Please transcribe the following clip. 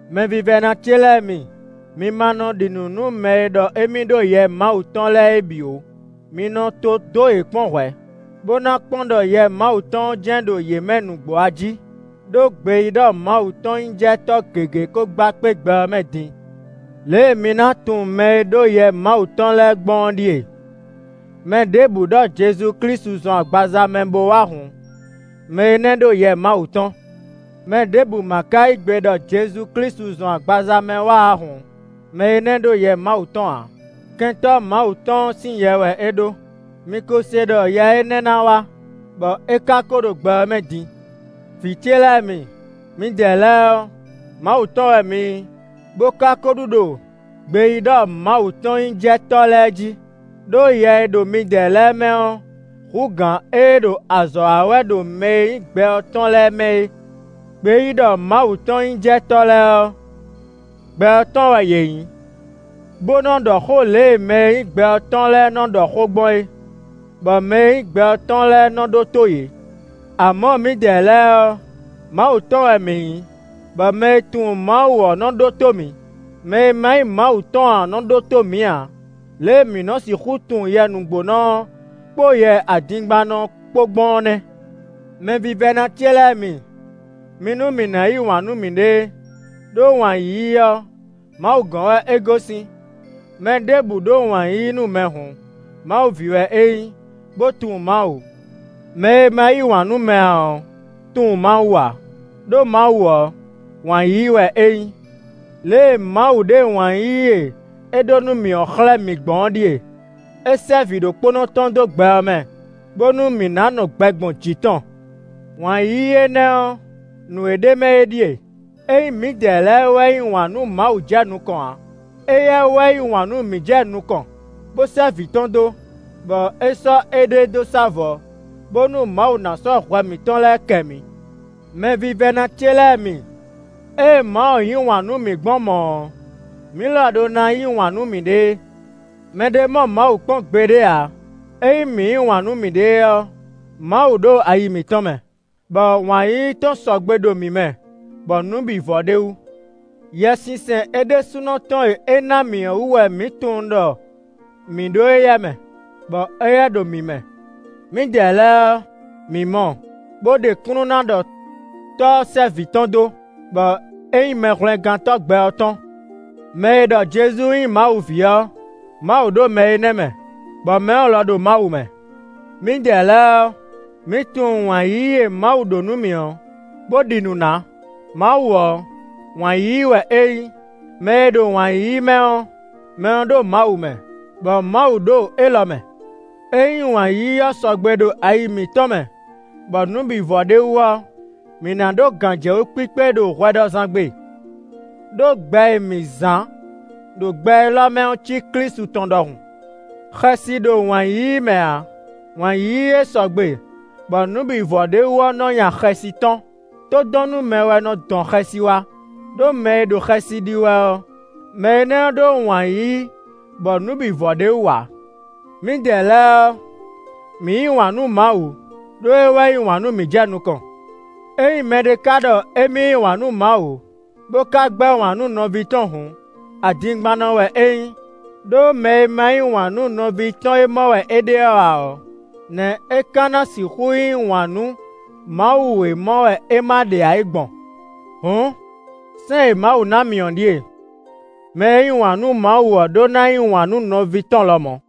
Mɛvívɛ́ná ce lɛ́ɛ mi, mi ma nɔ ɖi nǔ nú mɛ e ɖɔ émí ɖó Yɛ Mawu tɔn lɛ́ɛ é bǐ ó, mi nɔ to dó yě kpɔ́n hwɛ̌, bó ná kpɔ́n ɖɔ Yɛ Mawu tɔn ɔ́ jɛ́n ɖo yě mɛ nǔgbó ají; ɖó gbeyíɖɔmawutɔn-nyíjɛtɔ́ gěgé ko gba kpé gbɛ ɔ́ mɛ din. Lě e mi ná tunwun mɛ e ɖó Yɛ Mawu tɔn lɛ́ɛ gbɔn ɔ́ ɖíe: mɛ ɖěbǔ ɖɔ Jezu Klísu zɔn agbaza mɛ bo wá hǔn, mɛ énɛ́ ɖó Yɛ Mawu tɔn. Mɛ ɖěbǔ ma ka yí gbe ɖɔ Jezu Klísu zɔn agbaza mɛ wá ǎ hǔn, mɛ énɛ́ ɖó Yɛ Mawu tɔn ǎ; Kɛntɔ́ Mawu tɔn ɔ́ sín yɛ wɛ é ɖó. Mi ko se ɖɔ yɛ énɛ́ ná wá, bɔ é ka ko ɖo gbɛ ɔ́ mɛ din. Vǐ ce lɛ́ɛ mi, midɛɛ lɛ́ɛ ɔ́, Mawu tɔn wɛ mi nyí, bó ka ko ɖu ɖo gbeyíɖɔmawutɔn-nyíjɛtɔ́ lɛ́ɛ jí, ɖó Yɛ e ɖo midɛɛ lɛ́ɛ mɛ ɔ́ hú gǎn ée ɖo azɔ̌ wa wɛ ɖo mɛ e nyí gbɛ ɔ́ tɔn lɛ́ɛ mɛ é. Gbeyíɖɔmawutɔn-nyíjɛtɔ́ lɛ́ɛ ɔ́, gbɛ ɔ́ tɔn wɛ yě nyí, bó nɔ ɖɔ xó lě e mɛ e nyí gbɛ ɔ́ tɔn lɛ́ɛ nɔ ɖɔ xó gbɔn é, bɔ mɛ e nyí gbɛ ɔ́ tɔn lɛ́ɛ nɔ ɖótó yě. Amɔ̌, mǐdɛɛ lɛ́ɛ ɔ́, Mawu tɔn wɛ mǐ nyí, bɔ mɛ e tunwun Mawu ɔ́ nɔ ɖótó mǐ; mɛ e ma nyí Mawu tɔn ǎ ɔ́ nɔ ɖótó mǐ ǎ. Lě e mǐ nɔ sixú tunwun Yɛ nǔgbónɔ ɔ́, kpó yɛ adingbannɔ ɔ́ kpó gbɔn ɔ́ nɛ́. Mɛvívɛ́ná ce lɛ́ɛ mi, mi nú mǐ ná yí wǎn nú mǐɖée, ɖó wǎn yíyí ɔ́, Mawu gɔ́n wɛ é gosín. Mɛ ɖěbǔ ɖó wǎn yíyí nú mɛ hǔn, Mawu ví wɛ é nyí, bó tunwun Mawu. Mɛ e ma yí wǎn nú mɛ ǎ ɔ́ tunwun Mawu ǎ, ɖó Mawu ɔ́, wǎn yíyí wɛ é nyí. Lě e Mawu ɖe wǎn yíyí e é ɖó nú mǐ ɔ́ xlɛ́ mǐ gbɔn ɔ́ ɖíe: é sɛ́ vǐɖokpónɔ tɔn dó gbɛ ɔ́ mɛ, bónú mǐ ná nɔ gbɛ gbɔn jǐ tɔn. Wǎn yíyí énɛ́ ɔ́, nǔ e ɖ'é mɛ é ɖíe: ényí mǐdɛɛ lɛ́ɛ wɛ yí wǎn nú Mawu jɛ nukɔn ǎ; éyɛ́ wɛ yí wǎn nú mǐ jɛ nukɔn, bó sɛ́ vǐ tɔn dó, bɔ é sɔ́ éɖée dó sá vɔ̌, bónú Mawu ná sɔ́ hwɛ mǐtɔn lɛ́ɛ kɛ mǐ. Mɛvívɛ́ná ce lɛ́ɛ mi, ée Mawu yí wǎn nú mǐ gbɔn mɔ̌ ɔ́, mǐ lɔ ɖó ná yí wǎn nú mǐɖée. Mɛ ɖé mɔ Mawu kpɔ́n gbeɖé ǎ; ényí mǐ yí wǎn nú mǐɖée ɔ́, Mawu ɖo ayi mǐtɔn mɛ, bɔ wǎn yíyí tɔn sɔgbe ɖo mǐ mɛ bɔ nǔ bǐ vɔ ɖ'é wú. Yɛsinsɛn é ɖésúnɔ tɔn e é ná mǐ ɔ́ wú wɛ mǐ tunwun ɖɔ mǐ ɖo éyɛ́ mɛ, bɔ éyɛ́ ɖo mǐ mɛ. Mǐdɛɛ lɛ́ɛ ɔ́, mǐ mɔ bó ɖe kúnnu ná ɖɔ Tɔ́ ɔ́ sɛ́ Vǐ tɔn dó, bɔ é nyí Mɛhwlɛ́ngántɔ́ gbɛ ɔ́ tɔn. Mɛ e ɖɔ Jezu nyí Mawu ví ɔ́, Mawu ɖo mɛ énɛ́ mɛ, bɔ mɛ ɔ́ lɔ ɖo Mawu mɛ. Mǐdɛɛ lɛ́ɛ ɔ́, mǐ tunwun wǎn yíyí e Mawu ɖó nú mǐ ɔ́, bó ɖi nǔ ná. Mawu ɔ́, wǎn yíyí wɛ é nyí; mɛ e ɖo wǎn yíyí mɛ ɔ́, mɛ ɔ́ ɖo Mawu mɛ, bɔ Mawu ɖo élɔ́ mɛ. Ényí wǎn yíyí ɔ́ sɔgbe ɖo ayi mǐtɔn mɛ bɔ nǔ bǐ vɔ ɖ'é wú ɔ́, mǐ ná ɖó gǎnjɛwú kpíkpé ɖo hwɛɖɔzán gbe, ɖó gbɛ e mǐ zán ɖo gbɛ élɔ́ mɛ ɔ́ cí Klísu tɔn ɖɔhun. Xɛsi ɖo wǎn yíyí mɛ ǎ; wǎn yíyí e sɔgbe bɔ nǔ bǐ vɔ ɖ'é wú ɔ́ nɔ nya xɛsi tɔ́n. Tódɔnnúmɛ wɛ nɔ dɔn xɛsi wá; ɖó mɛ e ɖo xɛsi ɖi wɛ ɔ́, mɛ énɛ́ ɔ́ ɖó wǎn yíyí bɔ nǔ bǐ vɔ ɖ'é wú ǎ. Mǐdɛɛ lɛ́ɛ ɔ́, mǐ yí wǎn nú Mawu, ɖó é wɛ yí wǎn nú mǐ jɛ nukɔn. Ényí mɛɖé ka ɖɔ émí yí wǎn nú Mawu, bó ka gbɛ́ wǎn nú nɔví tɔn hǔn, adingbannɔ wɛ é nyí; ɖó mɛ e ma yí wǎn nú nɔví tɔn e mɔ wɛ é ɖe ɔ́ ǎ ɔ́, nɛ̌ é ka na sixú yí wǎn nú Mawu e mɔ wɛ é ma ɖe ǎ é gbɔn? Hǔn sɛ́n e Mawu ná mǐ ɔ́ ɖíe: mɛ e yí wǎn nú Mawu ɔ́ ɖó ná yí wǎn nú nɔví tɔn lɔmɔ̌.